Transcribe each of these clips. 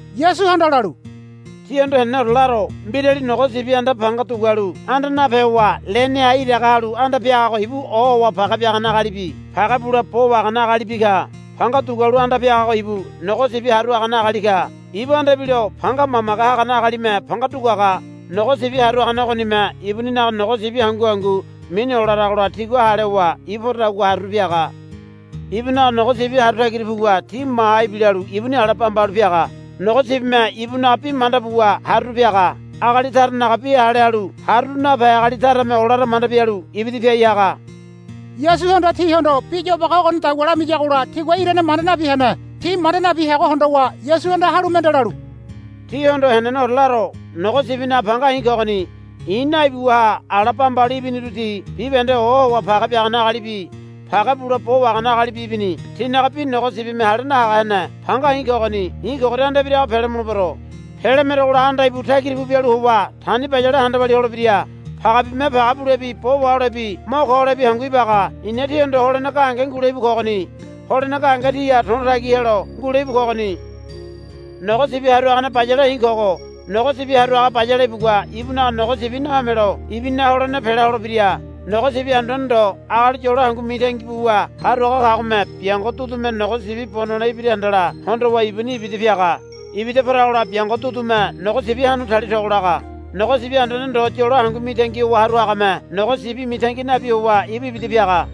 Yasuhanda lalu, Tíhondo heneneore laro. Mbirali nogo sibi anda panga dugualu anda nape howa leneha iraga halu anda piagago ibu ohowa page biagane agalibi page bule bo wahagane agalibi ka. Panga dugualu anda piagago ibu nogo sibi haru hagane agali ka. Ibu anda ibilo panga mamage hagane agalime panga duguaga. Nogo sibi haru hagane ogonime ibuninaga nogo sibi hangu hangu mini olaragola tigua hale howa ibu poradagua haruru piaga. Ibunaga nogo sibi haru tagira puwa ti maha ibilalu ibuni ala bamba halu piaga. Nogo sibime ibunaga bi manda buwa haruru piaga. Agali taranaga bi hale halu haruru nape agali tarame olara manda bialu ibida piai haga. Yasuhanda tihondo bi yobage ogonidagua lamiyagola tigua irane manda nabi hene. Ti manda nabi heago hondowa Yasuhanda halu mende lalu, Tíhondo heneneore laro. Nogo sibinaga panga i̱ kogoni. I̱ naibiwaha ala bamba halu ibiniru ti bibahende ohowa page biagane agalibi page bule bo wahagane agalibi ibini. Tinaga bi nogo sibime hale nahaga hene. Panga i̱ kogoni. I̱ kogoria anda ibirago pele mulebero. Pele merogola anda íbu tagira pu bialu howa tani bayale handa walia holebira. Pagebibime page bulebi bo waholebi mo ko holebi hangu ibaga. I̱na tíhondo holene gahenge ngule íbu kogoni. Holene gahenge tíha to̱lo tagi helo ngule íbu kogoni. Nogo sibi haru hagane bayale i̱ kogo. Nogo sibi haru haga bayale ibugua ibunaga nogo sibi nahomelo ibuninaga holene pela holebira. Nogo sibi anduane ndo agali yolo hangu mitangi buwa haru haga kagome biango dudume nogo sibi bo nole ibira handala hondowa ibuni ibida piaga. Ibida poragola biango dudume nogo sibi hanu tali togo laga. Nogo sibi anduane ndo howa yolo hangu mitangi buwa haru hagame nogo sibi mitangi nabi howa ibu ibida piaga.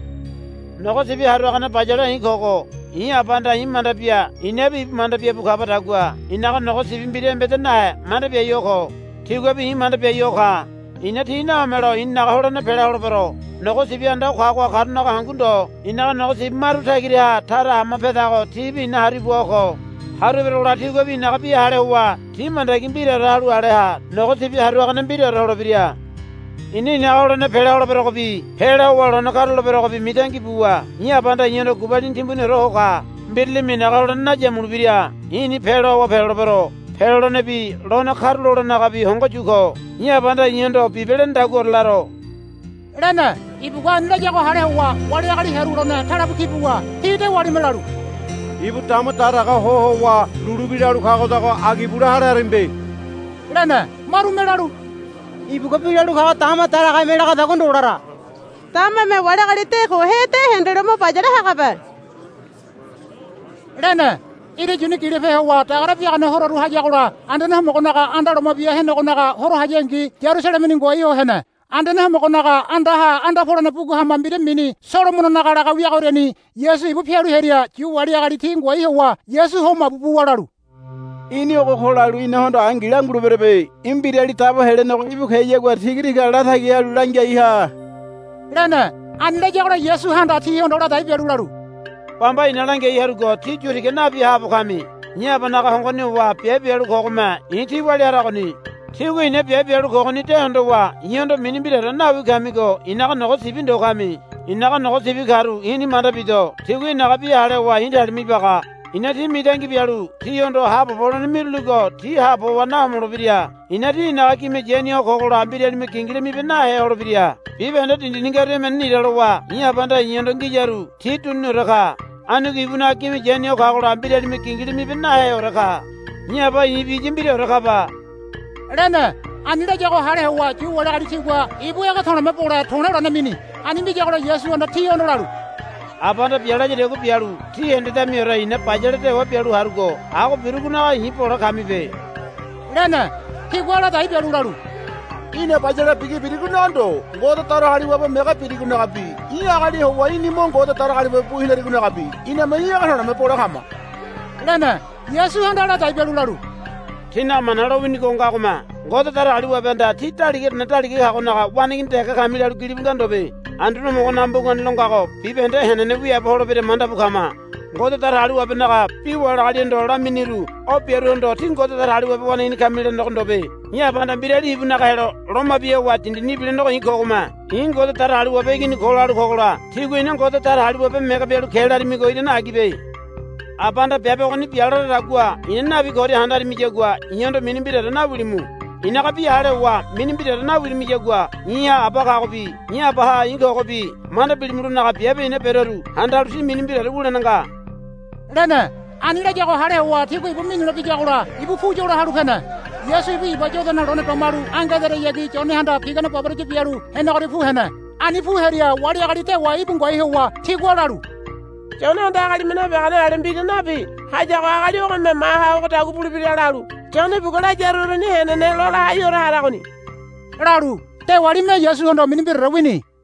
Nogo sibi haru hagane bayale i̱ kogo. I̱ Abahanda i̱ manda bia i̱nabi ibu manda bia bu kabadagua i̱naga nogo sibi mbira embeda nahe manda biai ho ko. Tiguabi i̱ manda biai ho ka. I̱na ti nahomelo i̱ninaga holene pela holebero. Nogo sibi anda o kagoha karunaga hangu ndo i̱naga nogo sibi maru tagiraha tara hama pedago tibi i̱na haru ibua ho ko. Haru eberogola tiguabi i̱naga bi hale howa ti mandagi mbiraore halu ale ha nogo sibi haru hagane mbiraore holebira. I̱na i̱naga holene pela holeberogobi pela howa lone karuloleberogobi mitangi buwa i̱ Abahanda i̱hondo gubalini timbuniore ho ka. Mbiralime i̱naga holene nayamulebira. I̱ni peloa howa pelolebero. Pelolenebi lone karulolenenagabi hongo yu kogo. I̱ Abahanda i̱hondo bibe lenedaguaore laro, lene. Ibugua ani layago hale howa wali agali hearu lone talebu ki buwa ti dewalime lalu, Ibu dama daraga ho howa lulu bi lalu kagodago agi bule hale haramibe, lene. Marume lalu, Ibugua bi lalu kago dama daragaheme lagadagua ndo lara. Damame wali agali de kohe de hendelo mo bayale hagabe, lene. Ira yuni gilope howa dagare biagane hororu hayagola Anduane Homogonaga anda Loma Bia Henegonaga horo hayangi Yarusalemeni ngoai ho hene. Anduane Homogonaga andaha anda polene bugu hama mbira mini Solomononaga laga wiagoriani Yasu ibu pialu hearia Yu wali agali ti ngoai howa Yasu ho mabu buwa lalu, Í̠ni ogo ko lalu inahondo angi languleberebe. Í̠ Mbirali Dabo Helenego íbu keyagua tiga tiga latagi halu langiai ha, lene. Ani layagola Yasuhanda tihondo ladai bialu lalu, Bamba i̱na langiai harugo tí yu tiga nabi haabo kami. I̱ Abanaga hongoni howa biabe bialu kogome i̱ tí walia haragoni. Tígua i̱na biabe bialu kogoni de hondowa i̱hondo mini mbiraore nawi kamigo i̱naga nogo sibi ndo kami. I̱naga nogo sibi karu i̱ni manda bido. Tigua i̱naga bi hale howa i̱ talima ibaga. I̱na ti mitangi bialu tihondo haabobo holene miruligo ti haabo howa nahomolebira. I̱na ti i̱naga gime yani ho kogola mbiralime gingila mibe nahe holebira. Bibahende dindini ngaru emene nira lowa i̱ Abahanda i̱hondo ngiyaru ti duniniore ka. Anigo ibunaga gime yani ho kagola mbiralime gingila mibe naheore ka. I̱ Aba i̱bi iya mbiraore kaba, lene. Ani layago hale howa Yu wali agali tigua ibu ege to̱le̱me bole to̱le̱ lone mini. Ani miyagola Yasuhanda tihondo lalu, Abahanda bia layadagua bialu ti hendedamiore i̱na bayale dewa bialu harugo ago birugonaga i̱ bole kamibe, lene. Tigua ladai bialu lalu, Í̠na bayale bigi birigonaga ndo Ngode Datagaliwabe mege birigonagabi í̠ agali howa í̠ni mo Ngode Datagaliwabe bu hinarigonagabi iname í̠ ege to̱le̱me bole kama, lene. Yasuhanda ladai bialu lalu, Tínaga Mana lowinigo ngagome, Ngode Datagaliwabehanda tí Daligaorene Daliganaga waneigini dege kami, lalu gilibu nga ndobe. Anduane Homogonaga mbugani lo ngago bibahende henene wiaabo holebira manda bu kama. Ngode Datagaliwabenaga bi wali agalihondo laminiru o biaruhondo, Tí Ngode Datagaliwabe waneigini kami, lene ndobe. I̱ Abahanda mbirali ibunaga helo loma bia howa dindini ibilenego i̱ kogome, I̱ Ngode Datagaliwabe Igini ko, lalu kogola tígua í̠na Ngode Datagaliwabe mege bialu ke larimigo irane agibe. Abahanda biabe ogoni bia laradagua i̱na nabi koria handarimiyagua i̱hondo mini mbiraore nawilimu. I̱naga bi hale howa mini mbiraore nawirimiyagua i̱ha Aba kagobi i̱ Abaha i̱ kogobi manda bilimulonaga biabe i̱na beroru handalu tí mini mbiraore wulene nga, lene. Ani layago hale howa tigua ibu minule biyagola ibu pu yola halu pene. Yasu ibu Iba Yodana lone domalu ange ederayagi Yonehanda pigane baboraya bialu henegoria pu hene. Ani pu hearia wali agali dewa íbu ngoai howa tigua lalu, Yonehanda agalime nabiagane ale mbira nabi hayago agali ogome maha ogodagua bulebira, lalu Yone ibugua layaru uruni henene lola haiore haragoni, lalu dewalime Yasuhondo mini mbiraore wini.